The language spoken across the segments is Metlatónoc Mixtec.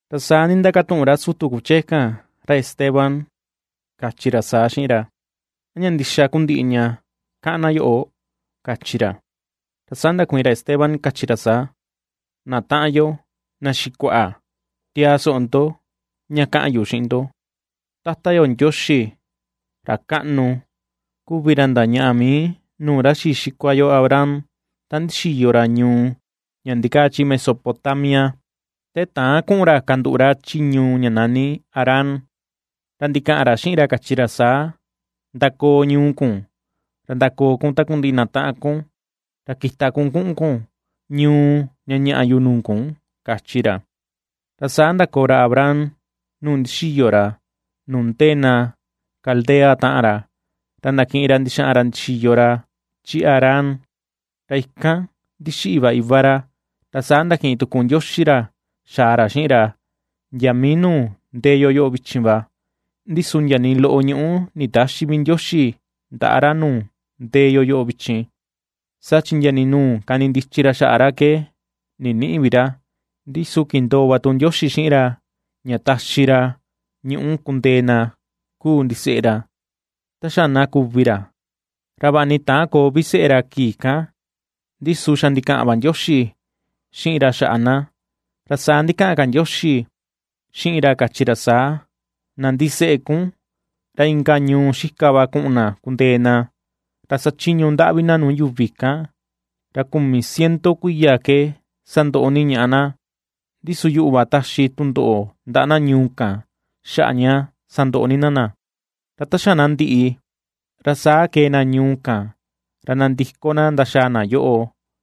Ra saa ndindakatuꞌun ra sutu kuchee kan ra Esteban, kachi ra saa xiꞌin ra: ―¿A ña ndixa kuu ndiꞌi ña kaꞌan na yoꞌo? ―kachi ra. Ra saa ndakuiin ra Esteban kachi ra saa: ―Na taꞌan yo, na xikuaꞌa, tiaa soꞌo ndo ña kaꞌan yu xiꞌin ndo. Tata yo Ndioxi, ra kaꞌnu, kuvi ra ndañaꞌa mii nuu ra xii xikua yo Abraham ta ndixiyo ra ñuu ña ndikaa chi Mesopotamia, te täan kuꞌun ra kanduꞌu ra chi ñuu ña nani Harán, ra ndikaꞌan ra xiꞌin ra, kachi ra saa: “Ndakoo ñuu kun, ra ndakoo kun takundiꞌi na taꞌan kun, ra kita kun kuꞌun kun ñuu ña ñaꞌa yu nuu kun” ―kachi ra. Ra saa ndakoo ra Abraham nuu ndixiyo ra, nuu ndee na Caldea taꞌan ra, ra ndakiꞌin ra ndixaꞌan ra ndixiyo ra chi Harán. Ra ikan ndixiꞌi va iva ra, ra saa ndakiꞌin tuku Ndioxi ra xaa ra xiꞌin ra, ndia mii nuu ndee yo yoꞌo vichin va. Ndi su ndia nii loꞌo ñuꞌu nditäxi vi Ndioxi ndaꞌa ra nuu ndee yo yoꞌo vichin, saa chi ndia ni nuu kanindichi ra xaꞌa ra ke ninïꞌi vi ra, ndi su kindoo va tu Ndioxi xiꞌin ra ña taxi ra ñuꞌu kundee na ^kuu ndiseꞌe ra, ta xa na kuvi ra. Ra vaꞌa ni täan koo vi seꞌe ra kii kan, ndi su xa ndikaꞌan va Ndioxi xiꞌin ra xaꞌa na. Ra saa ndikaꞌan ka Ndioxi xiꞌin ra kachi ra saa: “Na ndiseꞌe kun, ra inka ñuu xika va kuꞌun na kundee na, ra sachiñu ndaꞌvi na nuu yuvi kan, ra kumi ciento kuiya ke sandoꞌo ni ñaꞌa na. Ndi su yuꞌu va taxi tundoꞌo ndaꞌa na ñuu kan xaꞌa ña sandoꞌo ni na na, ra ta xa na ndiꞌi, ra saa kee na ñuu kan ra nandiko na ndaxaa na yoꞌo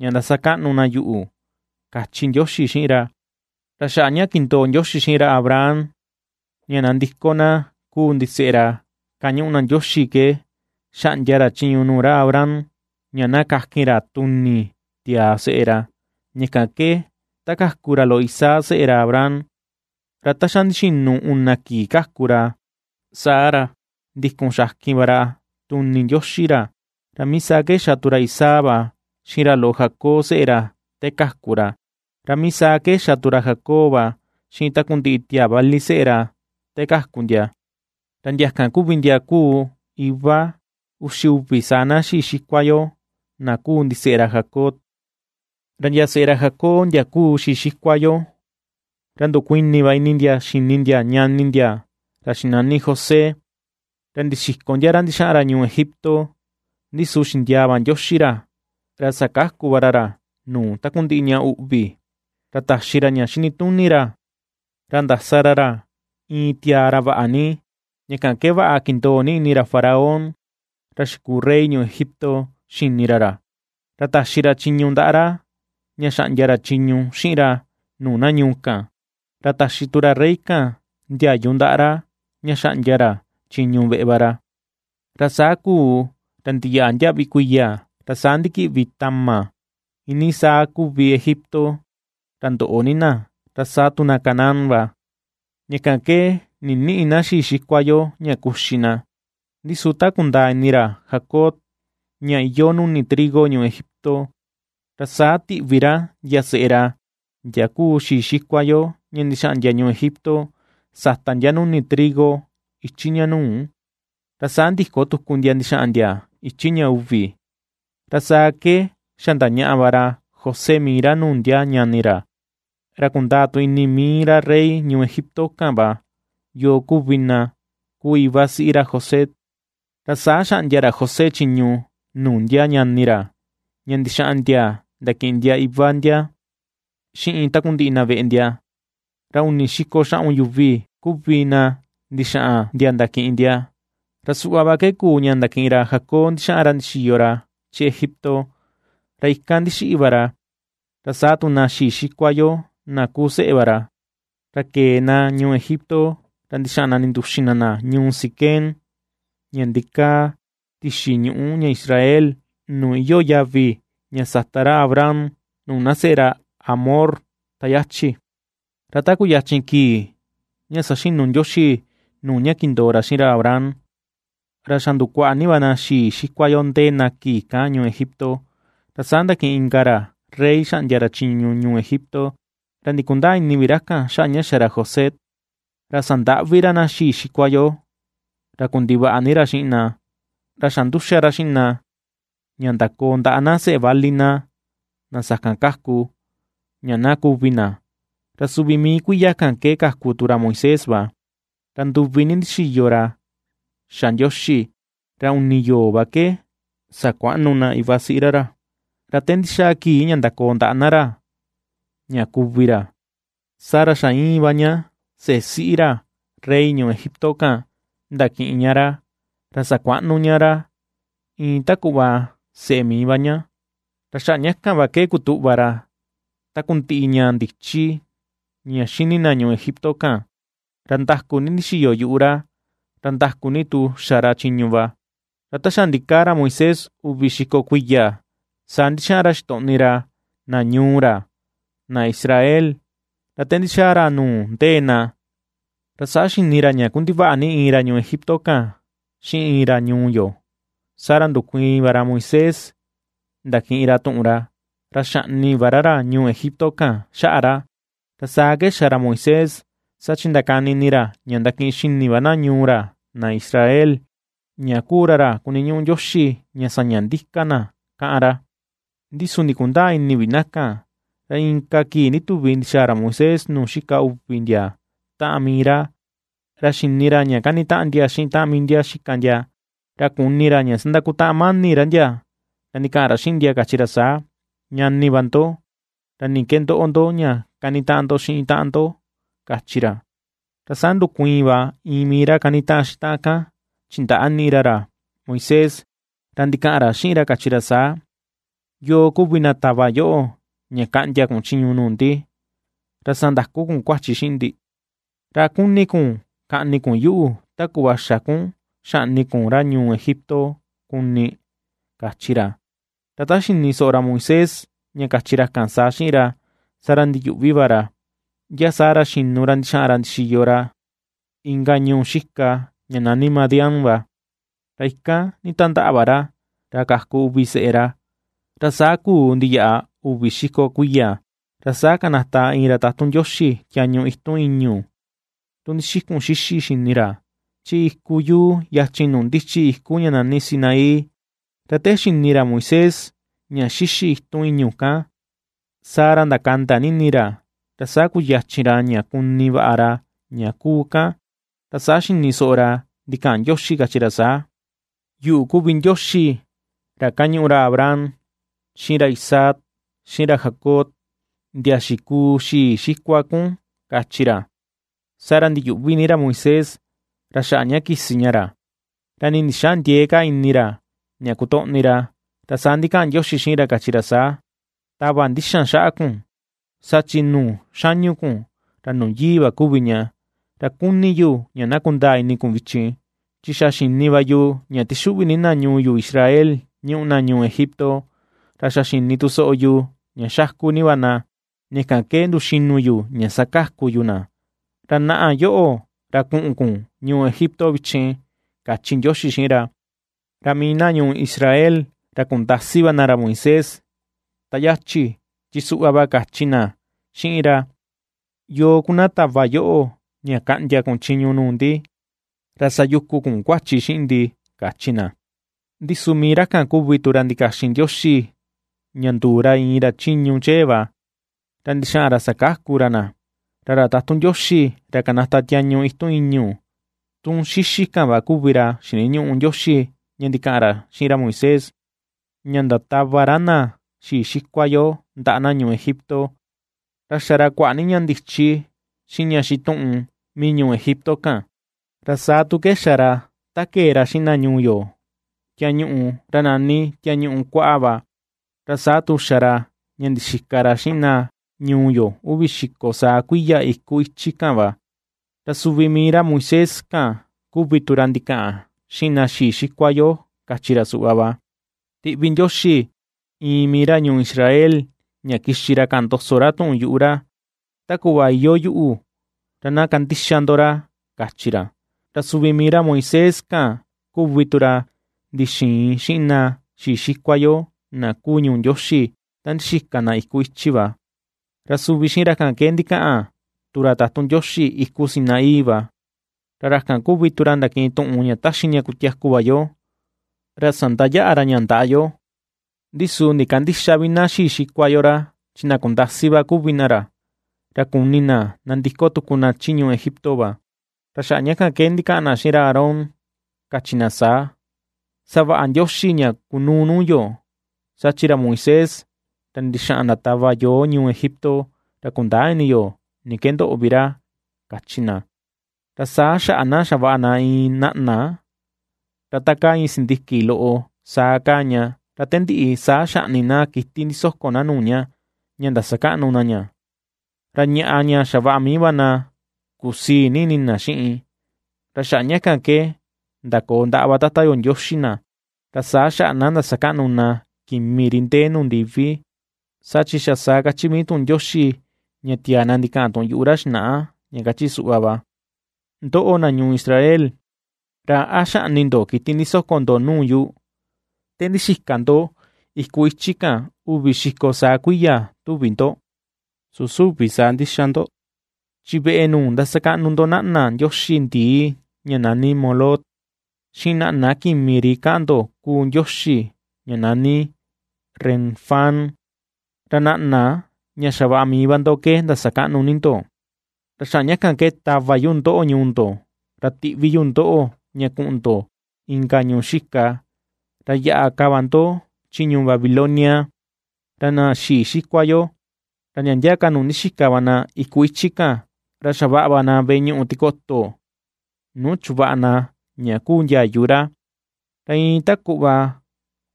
ña ndasakaꞌnu na yuꞌu”, kachi Ndioxi xiꞌin ra. Ra xaꞌa ña kindoo Ndioxi xiꞌin ra Abraham ña nandiko na kuu ndiseꞌe ra kañuꞌu na Ndioxi ke xaꞌndia ra chiñu nuu ra Abraham ña na kakin ra tuni tiaa seꞌe ra. Ña kan ke ta kaku ra loꞌo Isaac seꞌe ra Abraham, ra ta xa ndixinu una kii kaku ra saa ra ndikun xakin va ra tuni Ndioxi ra. Ra mii saa ke xa tu ra Isaac va xiꞌin ra loꞌo Jacob seꞌe ra te kaku ra, ra mii saa ke xa tu ra Jacob va xiꞌin takundiꞌi tiaa vali seꞌe ra te kaku ndia, ra ndia kan kuvi ndia kuu iva uxi uvi saa na xii xikua yo na kuu ndiseꞌe ra Jacob. ’Ra ndia seꞌe ra Jacob ndia kuu xii xikua yo, ra ndukuini va ini ndia xini ndia ñani ndia ra xinani José, ra ndixiko ndia ra ndixaꞌan ra ñuu Egipto. Ndi su xindiaa va Ndioxi ra, ra sakaku va ra ra nuu takundiꞌi ña uꞌvi. Ra taxi ra ña xinituni ra, ra ndasa ra ra iin tiaa ra vaꞌa ni, ña kan ke vaꞌa kindoo ni ini ra faraón ra xikuu rey ñuu Egipto xini ra ra, ra taxi ra chiñu ndaꞌa ra ña xaꞌndia ra chiñu xiꞌin ra nuu na ñuu kan, ra taxi tu ra rey kan ndiayu ndaꞌa ra ña xaꞌndia ra chiñu veꞌe va ra. ’Ra saa kuu, ra ndiyaꞌa ndiaꞌvi kuiya ra saa ndikiꞌvi tama iinii saa kuvi Egipto ra ndoꞌo ni na, ra saa tu Canaán va. Ña kan ke nïniꞌi na xii xikua yo ña kuxi na. Ndi su ta kundaa ini ra Jacob ña iyoo nuni trigo ñuu Egipto, ra saa tiꞌvi ra ndia seꞌe ra, ndia kuu xii xikua yo, ña ndixaꞌan ndia ñuu Egipto, sata ndia nuni trigo ichi ña nuu. Ra saa ndiko tuku ndia ndixaꞌan ndia ichi ña uvi, ra saa ke xa ndañaꞌa va ra José mii ra nuu ndia ñani ra, ra kundaa tu ini mii ra rey ñuu Egipto kan va yoo kuvi na kuu iva siꞌi ra José. Ra saa xaꞌndia ra José chiñu nuu ndia ñani ra ña ndixaꞌan ndia ndakiꞌin ndia iva ndia xiꞌin takundiꞌi na veꞌe ndia. Ra uni xiko xaꞌun yuvi kuvi na ndixaꞌan ndia ndakiꞌin ndia. Ra suꞌva va ke kuu ña ndakiꞌin ra Jacob ndixaꞌan ra ndixiyo ra chi Egipto, ra ikan ndixiꞌi va ra, ra saa tu na xii xikua yo na kuu seꞌe va ra. Ra kee na ñuu Egipto ra ndixaꞌan na ninduxin na na ñuu Siquem ña ndikaa tixin ñuꞌu ña Israel, nuu iyoo yavi ña sata ra Abraham nuu na seꞌe ra Hamor ta yachi. ’Ra ta kuyachin kii ña saxinu Ndioxi nuu ña kindoo ra xiꞌin ra Abraham, ra xa ndukuaꞌa ni va na xii xikua yo ndee na kii kan ñuu Egipto. Ra saa ndakiꞌin inka ra rey xaꞌndia ra chiñu ñuu Egipto, ra ndikundäa ini vi ra kan xaꞌa ña xa ra José. Ra sandaꞌvi ra na xii xikua yo ra kundivaꞌa ni ra xiꞌin na, ra xa nduxa ra xiꞌin na ña ndakoo ndaꞌa na seꞌe vali na, na sakan kaku, ña na kuvi na. Ra suvi mii kuiya kan ke kaku tu ra Moisés va. Ra nduvi ni ndixiyo ra xa Ndioxi, ra uni yoo va ke sakuaꞌnu na iva siꞌi ra ra. Ra te ndixaa kii ña ndakoo ndaꞌa na ra ña kuvi ra, saa ra xa íin va ña seꞌe siꞌi ra rey ñuu Egipto kan ndakiꞌin ña ra, ra sakuaꞌnu ña ra, iin ta kuꞌva seꞌe mii va ña. Ra xaꞌa ña kan va ke kutuꞌva ra takundiꞌi ña ndichi ña xini na ñuu Egipto kan, ra nda̱ku̱ ni ndixiyo yuꞌu ra, ra nda̱ku̱ ni tu xa ra chiñu va. ’Ra ta xa ndikaa ra Moisés uvi xiko kuiya, saa ndixaꞌan ra xitoꞌni ra, na ñuu ra, na Israel. Ra te ndixaa ra nuu ndee na, ra saa xini ra ña kundivaꞌa ni iin ra ñuu Egipto kan xiꞌin iin ra ñuu yo. Saa ra ndukuiin va ra Moisés ndakiꞌin ra tuꞌun ra, ra xaꞌni va ra ra ñuu Egipto kan xaꞌa ra. Ra saa ke xa ra Moisés, saa chi ndakani ini ra ña ndakiꞌin xini va na ñuu ra na Israel, ña kuu ra ra kuniñuꞌu Ndioxi ña saña ndika na kaꞌan ra, ndi su ndikundäa ini vi na kan. Ra inka kii ndituvi ndixaa ra Moisés nuu xika uvi ndia taꞌan mii ra, ra xini ra ña kanitaꞌan ndia xiꞌin taꞌan ndia xika ndia, ra kuni ra ña sandakutaꞌan mani ra ndia, ra ndikaꞌan ra xiꞌin ndia kachi ra saa: “Ñani va ndo, ¿ra ni ke ndoꞌo ña kanitaꞌan ndo xiꞌin taꞌan ndo?”, kachi ra. Ra saa ndukuiin va iin mii ra kanitaꞌan xiꞌin taꞌan kan chindaꞌni ra ra Moisés, ra ndikaꞌan ra xiꞌin ra kachi ra saa: “¿Yoo kuvi na tava yoꞌo ña kaꞌndia kun chiñu nuu ndi, ra ^sandaku kun kuachi xiꞌin ndi? ¿Ra a kuni kun kaꞌni kun yuꞌu, ta kuꞌva xa kun xaꞌni kun ra ñuu Egipto kuni?”, kachi ra. Ra ta xini soꞌo ra Moisés ña kachi ra kan saa xiꞌin ra, saa ra ndiyuꞌvi va ra, ndia saa ra xinu ra ndixaꞌan ra ndixiyo ra inka ñuu xika ña nani Madián va, ra ikan nditandaꞌa va ra, ra kaku uvi seꞌe ra. ’Ra saa kuu ndiyaꞌa uvi xiko kuiya, ra saa kanata iin ra tatun Ndioxi tiañu itun ìñu̱, tun ndixikun xíxî xini ra, chi iku yuu yachin nuu ndichi iku ña nani Sinaí. Ra te xini ra Moisés ña xíxî itun ìñu̱ kan, saa ra ndakanda ni ini ra. Ra saa kuyachin ra ña kuni vaꞌa ra ña kuu kan, ra saa xini soꞌo ra ndikaꞌan Ndioxi kachi ra saa: “Yuꞌu kuvi Ndioxi ra ^kañuꞌu ra Abraham, xiꞌin ra Isaac, xiꞌin ra Jacob. Ndia xikuu xii xikua kun”, kachi ra. Saa ra ndiyuꞌvi ni ra Moisés ra xaꞌa ña kisi ña, ra nii ndixäa ndiee ka ni ra ña kotoꞌni ra. Ra saa ndikaꞌan Ndioxi xiꞌin ra kachi ra saa: “Tava ndixan xaꞌa kun, saa chi nuu xañu kun, ra nuu yii va kuvi ña. Ra kuni yu ña na kundaa ini kun vichin, chi xa xini va yu ña tixuꞌvi ni na ñuu yu Israel ñuꞌu na ñuu Egipto, ra xa xini tu soꞌo yu ña xaku ni va na, ña kan ke nduxinu yu ña sakaku yu na. Ra naꞌa yoꞌo ra kuꞌun kun ñuu Egipto vichin”, kachi Ndioxi xiꞌin ra. ’Ra mii na ñuu Israel ra kundasi va na ra Moisés ta yachi chi suꞌva va kachi na xiꞌin ra: “¿Yoo kuu na tava yoꞌo ña kaꞌndia kun chiñu nuu ndi, ra sayukun kun kuachi xiꞌin ndi?”, kachi na. Ndi su mii ra kan kuvi tu ra ndikaxin Ndioxi ña nduu ra iin ra chiñu chee va, ra ndixaꞌan ra sakaku ra na. Ra ra tatun Ndioxi ra kanata tiañu itun ìñu̱, tun xíxî kan va kuvi ra xiniñuꞌu Ndioxi ña ndikaꞌan ra xiꞌin ra Moisés ña ndatava ra na xii xikua yo ndaꞌa na ñuu Egipto. Ra xa ra kuaꞌa ni ña ndichi xiꞌin ña xituꞌun mii ñuu Egipto kan, ra saa tu ke xa ra ta kee ra xiꞌin na ñuu yo tiañuꞌu, ra nani Tiañuꞌu Kuaꞌa va, ra saa tu xa ra ña ndixika ra xiꞌin na ñuu yo uvi xiko saa kuiya iku ichi kan va. Ra suvi mii ra Moisés kan kuvi tu ra ndikaꞌan xiꞌin na xii xikua yo kachi ra suꞌva va: “Tiꞌvi Ndioxi iin mii ra ñuu Israel ña kixi ra kaꞌan ndoso ra tuꞌun yuꞌu ra, ta kuꞌva iyoo yuꞌu, ra na kandixa ndo ra”, kachi ra. Ra suvi mii ra Moisés kan kuvi tu ra ndixiin xiꞌin na xii xikua yo na kuu ñuu Ndioxi ta ndixika na iku ichi va, ra suvi xiꞌin ra kan ke ndikaꞌan tu ra tatun Ndioxi iku Sinaí va, ra ra kan kuvi tu ra ndakiꞌin tuꞌun ña ^taxi ña kutiaku va yo, ra sandayaꞌa ra ña ndaꞌa yo. ’Ndi su ndikandïxa vi na xii xikua yo ra, chi na kundasi va kuvi na ra, ra kuni na nandiko tuku na chi ñuu Egipto va. Ra xaꞌa ña kan ke ndikaꞌan na xiꞌin ra Aarón kachi na saa: “Savaꞌa ndioxi ña kunuu nuu yo, saa chi ra Moisés ra ndixaꞌan ndatava yoo ñuu Egipto, ra kundäa ini yo ni ke ndoꞌo vi ra”, kachi na. Ra saa xaꞌa na xavaꞌa na iin naꞌna ra ta kaa iin sindiki loꞌo saa kaa ña, ra te ndiꞌi saa xaꞌni na kiti ndisoko na nuu ña, ña ndasakaꞌnu na ña; ra ñaꞌa ña xavaꞌa mii va na kusii ni ini na xiꞌin. Ra xaꞌa ña kan ke ndakoo ndaꞌa va Tata yo Ndioxi na, ra saa xaꞌa na ndasakaꞌnu na kimi ri ndee nuu ndiví. Saa chi xa saa ^kachi mii tuꞌun Ndioxi ña tiaa na ndikaꞌan tuꞌun yuꞌu ra xinaꞌa, ña kachi suꞌva va: Ndoꞌo, na ñuu Israel, ¿ra a xaꞌni ndo kiti ndisoko ndo nuu yu, te ndixika ndo iku ichi kan uvi xiko saa kuiya, tuvi ndo? Su süvi saa ndixa ndo; chi veꞌe nuu ndasakaꞌnu ndo naꞌna ndioxi ndii ña nani Moloc, xiꞌin naꞌna kimi ri kaꞌan ndo kuu ndioxi ña nani Renfán, ra naꞌna ña xavaꞌa mii va ndo ke ndasakaꞌnu ni ndo. Ra xaꞌa kan ke tava yu ndoꞌo ñuu ndo, ra tiꞌvi yu ndoꞌo ña kuꞌun ndo inka ñuu xika, ra yaꞌa ka va ndo chi ñuu Babilonia. ’Ra na xii xikua yo, ra ndia ndia ka nuu ndixika va na ikun ichi kan, ra xavaꞌa na veꞌe ñuꞌu tikoto nuu chuvaꞌa na ña kuu ndiayu ra. Ra iin ta kuꞌva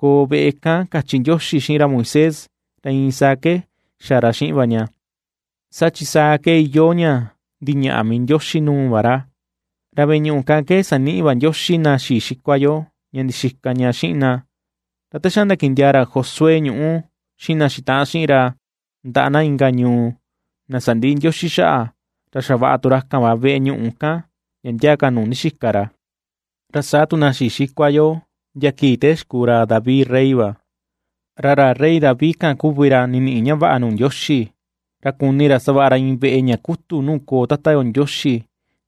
koo veꞌe kan kachi Ndioxi xiꞌin ra Moisés, ra iin saa ke xa ra xiꞌin va ña, saa chi saa ke iyoo ña ndiñaꞌa mii Ndioxi nuu va ra. Ra veꞌe ñuꞌu kan ke saniꞌi va Ndioxi na xii xikua yo, ña ndixika ña xiꞌin na. Ra ta xa ndakiꞌin ndiaa ra Josué ñuꞌu xiꞌin na xitaꞌan xiꞌin ra ndaꞌa na inka ñuu, na sandiꞌi Ndioxi xaꞌa, ra xavaꞌa tu ra kan va veꞌe ñuꞌu kan ndia ndia ka nuu ndixika ra. Ra saa tu xa na xii xikua yo ndia kii ta xikuu ra David rey va. Ra ra rey David kan kuvi ra niniꞌi ña vaꞌa nuu Ndioxi, ra kuni ra savaꞌa ra iin veꞌe ña kutu nuu koo Tata yo Ndioxi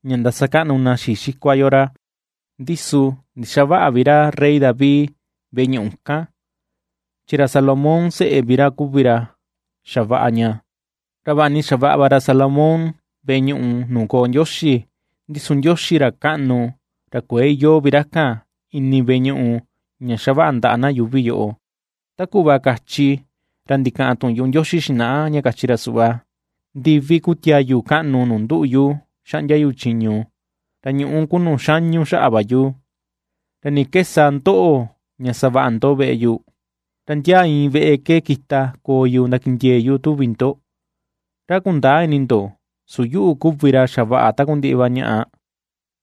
ña ndasakaꞌnu na xii xikua yo ra; ndi su ndixaväꞌa vi ra rey David veꞌe ñuꞌu kan, chi ra Salomón seꞌe vi ra kuvi ra xavaꞌa ña. Ra vaꞌa ni xavaꞌa va ra Salomón veꞌe ñuꞌu nuu koo Ndioxi, ndi su Ndioxi ra kaꞌnu, ra kuëe iyoo vi ra kan ini veꞌe ñuꞌu ña xavaꞌa ndaꞌa na yuuvi yoꞌo, ta kuꞌva kachi ra ndikaꞌan tuꞌun yuꞌu Ndioxi xinaꞌa, ña kachi ra suꞌva: Ndivi kuu tiayu kaꞌnu nuu nduꞌu yu xaꞌndia yu chiñu, ra ñuꞌu kuu nuu xañu xaꞌa va yu. ¿Ra ni ke sa tu ndoꞌo ña savaꞌa ndo veꞌe yu? ¿Ra ndia iin veꞌe ke kita koo yu ndakindiee yu, tuvi ndo? Ra a kundäa ini ndo su yuꞌu kuvi ra xavaꞌa takundiꞌi va ñaꞌa,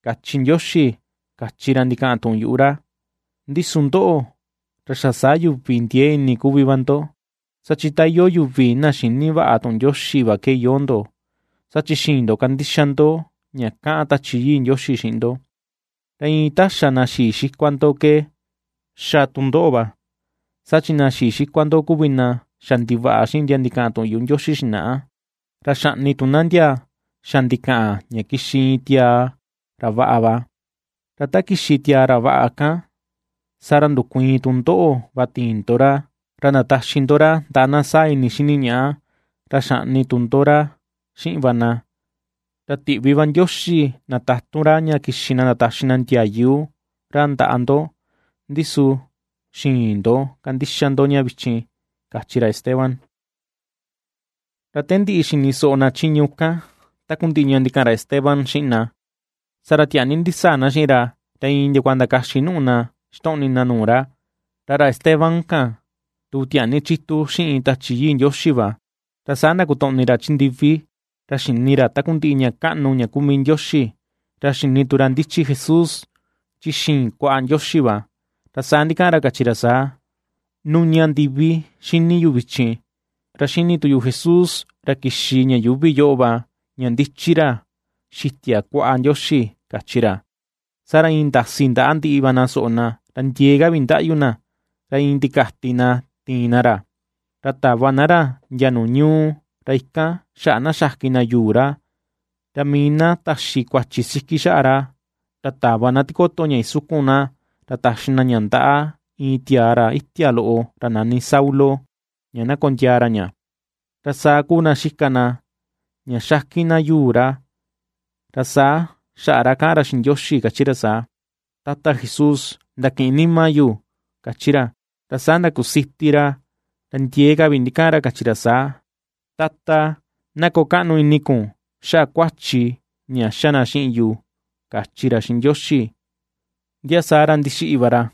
kachi Ndioxi, kachi ra ndikaꞌan tuꞌun yuꞌu ra. ’Ndi su ndoꞌo, ra xa saa yuvi ndiee ni ini kuvi va ndo, saa chi ta iyoo yuvi na xïni vaꞌa tuꞌun Ndioxi va ke iyoo ndo. Saa chi xïin ndo kandixa ndo ña kaꞌan Tachi Yii Ndioxi xiꞌin ndo. Ra iin ta xa na xii xikua ndo ke ^xa tu ndoꞌo va. Saa chi na xii xikua ndo kuvi na xa ndivaꞌa xiꞌin ndia ndikaꞌan tuꞌun yuꞌu Ndioxi xinaꞌa; ra xaꞌni tu na ndia xa ndikaꞌan ña kixi iin tiaa ra vaꞌa va. Ra ta kixi tiaa ra vaꞌa kan, saa ra ndukuiin tu ndoꞌo va tiin ndo ra, ra ndataxi ndo ra ndaꞌa na saa ini xini ñaꞌa, ra xaꞌni tu ndo ra xiꞌin va na. Ra tiꞌvi vaꞌa Ndioxi na tatun ra ña kixi na ndataxi na ndiayu ra ndaꞌa ndo, ndi su xïin ndo kandixa ndo ña vichin ―kachi ra Esteban. Ra ta ndiꞌi xini soꞌo na chiñu kan takundiꞌi ña ndikaꞌan Esteban xiꞌin na, saa ra tiaa ni ndisaa na xiꞌin ra, ra iin ndiakua ndakaxi nùꞌù na ixtoꞌni na nuu ra. Ra ra Esteban kan tu, tiaa ni chitu xiꞌin Tachi Yii Ndioxi va, ra saa ndakotoꞌni ra chi ndivi, ra xini ra takundiꞌi ña kaꞌnu ña kuu mii Ndioxi, ra xini tu ra ndichi Jesús chi xiin kuaꞌa Ndioxi va. Ra saa ndikaꞌan ra kachi ra saa: ―¡Nuña ndivi ^xini yu vichin, ra ^xini tu yu Jesús ra kixi ña yuuvi yoꞌo va ña ndichi ra xitia kuaꞌa Ndioxi! ―kachi ra. Saa ra iin ndasi ndaꞌa ndiꞌi va na soꞌo na, ra ndiee ka vi ndaꞌyu na, ra iin ndikati na tiin na ra. Ra tava na ra ndia nuu ñuu, ra ikan xaꞌa na xakin na yuu ra; Ra mii na taxi kuachi siki xaꞌa ra, ra tava na tikoto ña isukun na, ra taxi na ña ndaꞌa iin tiaa ra itia loꞌo ra nani Saulo, ña na kondiaa ra ña. Ra saa kuu na xika na ña xakin na yuu ra, ra saa xaꞌa ra kaꞌan ra xiꞌin Ndioxi kachi ra saa: ―Tata Jesús, ndakiꞌin nima yu ―kachi ra. Ra saa ndakusiti ra, ra ndiee ka vi ndikaꞌan kachi ra saa: ―Tata, na koo kaꞌnu ini kun xaꞌa kuachi ña xa na xiꞌin yu ―kachi ra xiꞌin Ndioxi. Ndia saa ra ndixiꞌi va ra.